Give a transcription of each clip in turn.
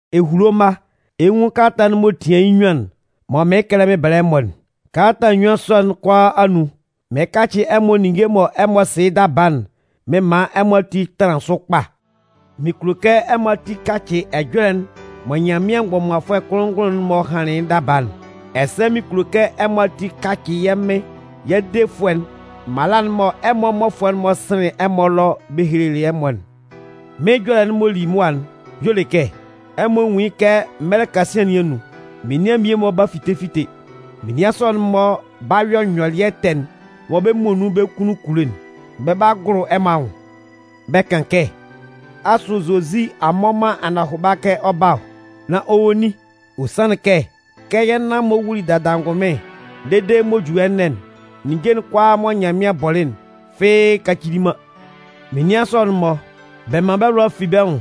Ehulo mma, ɛ 'nwun kalata'n m'ɔ tian yɩ́ nnyuan'n mɔ mɩɩn kɛlɛ mɩn bɛlɛ ɛmɔ'n. Kalata nnyuan sɔ'n kʋalaa anun, mɩn kacɩ ɛmɔ ninnge mɔ ɛmɔ sɩ yɩ́ daba'n mɩn man ɛmɔ ati tanlan sʋ kpa. Mɩn kulo kɛ ɛmɔ ati kacɩ ɛjɔlɛ'n mɔ Nyanmɩan mgbɔmanfʋɛ kʋnlʋn-ngʋnlʋn'n-mɔ hanlɩn yɩ́ daba'n. Ɛsɛ mɩn kulo kɛ ɛmɔ ati kacɩ yɛ́ Mɩn yɛ́ Defʋɛ'n mala'n mɔ ɛmɔ mmɔfʋɛ'n-mɔ sɩnlɩn ɛmɔ ɛlɔ bɛ hehelelɩ ɛmɔ'n. Mɩ́n ɛjɔlɛ'n m'ɔ li mʋa'n y'ɔ le kɛ, ɛmɔ nwún yɩ́ kɛ mɛlɛ kasian nɩn anun, menian mmie-mɔ 'ba fite fite. Menian sɔ'n-mɔ 'ba yɔ nyɔlɩɛ ɛtɛ'n mɔ bɛ́ muonun bɛ́ kunnun kulo'n. Bɛ 'ba gʋlʋ ɛmɔ anwʋn bɛ kan kɛ: “Asʋ Zozi a mmɔ man anɔhʋba kɛ ɔ 'ba ɔ? Nan ɔ wɔ nin? Ɔ sanlɩn kɛ, kɛ yɛ́ nan-mɔ wuli dada angʋnmɩn dede m'ɔ ju ɛnɛ'n, ninnge'n kʋalaa mɔ Nyanmɩan bɔlɩ'n, fɩ́ɩ́ kacili man!” Menian sɔ'n-mɔ, bɛ man bɛ́ lʋa fi bɛ́ nwʋn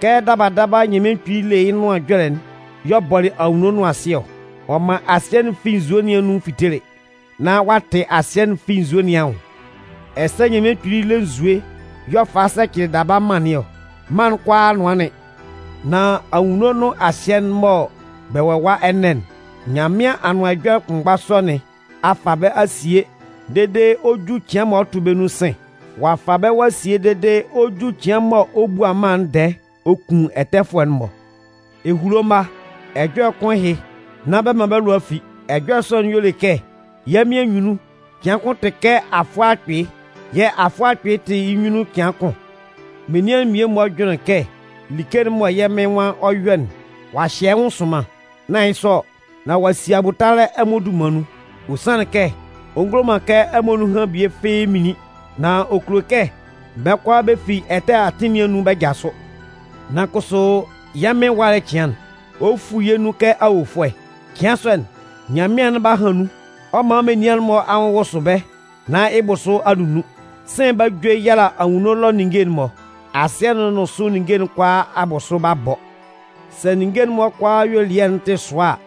kɛ daba daba, Nyanmɩan Kpili le yɩ́ Nʋan Ɛjɔlɛ'n y'ɔ bɔlɩ anwunno nʋn asɩ ɔ. Ɔ man asɩɛ'n fi nzue nun fitelɩ, nan ɔ'a tɩ asɩɛ'n fi nzue nɩn anwʋn. Ɛsɛ Nyanmɩan kpili le nzue y'ɔ falɩ sɛcɩlɩ daba mân nɩn ɔ. Mân'n kʋalaa nʋanlɩn. Nan anwunno nʋn asɩɛ'n mɔ bɛ wɔ ɛwa ɛnɛ'n, Nyanmɩan Anʋan Ɛjɔlɛ kʋnmgba sɔ nɩn a fa bɛ́ a sie dede ɔ 'ju cɩan mɔ ɔ 'tʋ bɛ́ nun sɩ̂n. Ɔ'a fa bɛ́ ɔ'a sie dede ɔ 'ju cɩan mɔ ɔ 'bua mân'n ndɛɛ ɔ kun ɛtɛfʋɛ'n-mɔ. Ehulo mma, ɛjɔlɛ kʋn ɛhɩ, nán bɛ man bɛ́ lʋa fi. Ɛjɔlɛ sɔ'n y'ɔ le kɛ yɛ́ Mɩn anyunnun, cɩan kʋn tɩ kɛ afʋɛ akpɩɩ, yɛ̂ “afʋɛ akpɩɩ tɩ yɩ́ nyunnun cɩan kʋn.” Menian'n mmie-mɔ jʋnlɩn kɛ like'n mɔ yɛ́ Mɩn nwan ɔ 'yɔ'n, ɔ'a hyɛ yɩ́ nwʋn sʋnman. Nán yɩ́ sɔ ɔ, nán ɔ'a si abʋtalɛ ɛmɔ dunman nun. Ɔ sanlɩn kɛ ɔ ngulo man kɛ ɛmɔ nunhan bie fɩ́ɩ́ minlin, nan ɔ kulo kɛ bɛ́ kʋalaa bɛ fi bɛ́ ɛtɛ nɩn anun bɛ jasʋ. Nan kʋsʋ yɛ́ Mɩn ɛwalɛ cɩan'n, ɔ 'fu yɛ́ nun kɛ awofʋɛ. Cɩan sɔ'n, nyanmɩan'n 'ba han nun, ɔ 'man menian'n-mɔ anwʋn wʋsʋ bɛ́ nán yɩ́ bʋsʋ a nunnun. Sɩ̂n 'ba jue yala anwunno ɛlɔ ninnge'n-mɔ. Asɩɛ'n nʋn sʋ ninnge'n kʋalaa abʋsʋ 'ba bɔ. Sɛ ninnge'n-mɔ kʋalaa ayuelɩɛ'n tɩ sʋa a,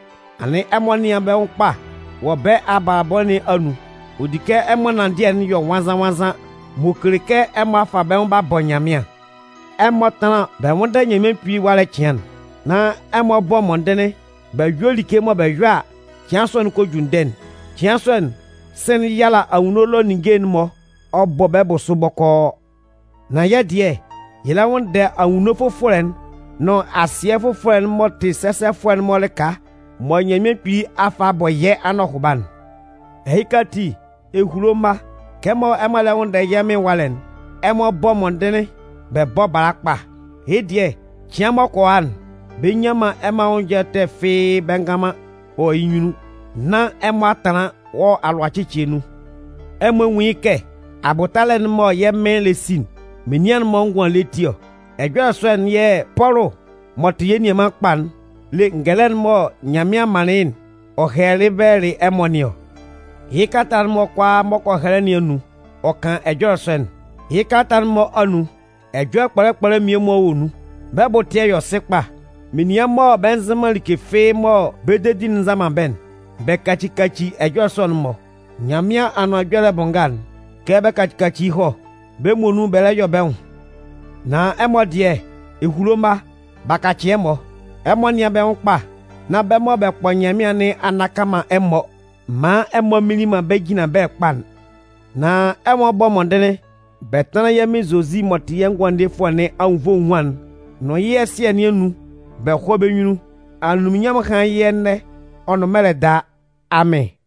anɩn ɛmɔ nɩ́an bɛ́ nwʋn kpa wɔ bɛ́ abalabɔ nɩn anun. Ɔ di kɛ ɛmɔ ɛnanndɩɛ'n yɔ nwannzan-nwannzan m'ɔ kele kɛ ɛmɔ a fa bɛ́ nwʋn b'a bɔ Nyanmɩan. Ɛmɔ tánlan bɛ nwʋ́nndɛ Nyanmɩan Kpili ɛwalɛ cɩan'n, nán ɛmɔ bɔ́ mɔndɩnlɩn bɛ yɔ́ like mɔ bɛ yɔ a, cɩan sɔ'n kɔ ju ndɛ'n. Cɩan sɔ'n, sɩ̂n'n 'yala anwunno ɛlɔ ninnge'n-mɔ ɔ bɔ bɛ́ bʋsʋ bɔkɔɔ! Nan yɛ́ dɩɛ, yɛ lɛ nwʋnndɛ anwunno fʋfɔlɛ'n, nʋn asɩɛ fʋfɔlɛ'n m'ɔ tɩ sɛsɛfʋɛ'n-mɔ lɩka mɔ Nyanmɩan Kpili a fa a bɔ yɛ́ anɔhʋba'n. Ɛhɩ ati, ehulo mma, kɛmɔ ɛmɔ lɛ nwʋnndɛ yɛ́ Mɩn ɛwalɛ'n, ɛmɔ bɔ́ mɔndɩnlɩn bɛ bɔ́ bala kpa. Yɩ́ dɩɛ, cɩan m'ɔ kɔ a'n, bɛ nnyan man ɛmɔ anwʋn ɛjɔlɛ ɛtɛ fɩ́ɩ́ bɛ ngan man wɔ yɩ́ nyunnun, nán ɛmɔ a tanlan wɔ alʋacɩcɩɛ nun. Ɛmɔ nwún yɩ́ kɛ abʋtalɛ'n mɔ yɛ́ Mɩn lɛ si'n, menian'n-mɔ ngʋan ele ti ɔ. Ɛjɔlɛ sɔ'n yɛ̂ Pɔlʋ m'ɔ tɩ yɛ́ nianman kpa'n le ngɛlɛ'n mɔ Nyanmɩan manlɩn yɩ́'n ɔ hɛlɛlɩ bɛlɛlɩ ɛmɔ nɩn ɔ. Yɩ́ kalata'n-mɔ kʋalaa m'ɔ kɔ hɛlɛ nɩn anun, ɔ kan ɛjɔlɛ sɔ'n. Yɩ́ kalata'n-mɔ anun, ɛjɔlɛ kpɔlɛ kpɔlɛ mmie-mɔ wɔ nun, bɛ́ bʋ ɛtɩɛ yɔ sɩ kpa. Menian mɔ bɛ nzɩ man like fɩ́ɩ́ mɔ bɛ́ dedi'n nza man bɛ́'n, bɛ kaci kaci ɛjɔlɛ sɔ'n-mɔ. Nyanmɩan Anʋan Ɛjɔlɛ bʋ nga'n, kɛ bɛ kaci kaci yɩ́ hɔ. Bɛ́ muonun bɛ lɛ yɔ bɛ́ nwʋn. Nan ɛmɔ dɩɛ, ehulo mma, b'a kacɩ ɛmɔ. Ɛmɔ nɩ́an bɛ́ nwʋn kpa, nán bɛ́ mɔ bɛ kpɔ Nyanmɩan nɩn a nnaka man ɛmɔ maan ɛmɔ a minlin man bɛ́ jinlanbɛlɛ kpa'n. Nan ɛmɔ bɔ́ mɔndɩnlɩn bɛ tánlan yɛ́ Mɩn Zozi m'ɔ tɩ yɛ́ Ngʋandefʋɛ nɩn anwunnvoe enwuan'n nʋn yɩ́ ɛsɩɛ nɩn anun bɛ hɔ́ bɛ́ nyunnun. Anunminnyanmʋn hán yɩ́ ɛnɛ, ɔ nʋn mɛlɛ daa! Amɩn.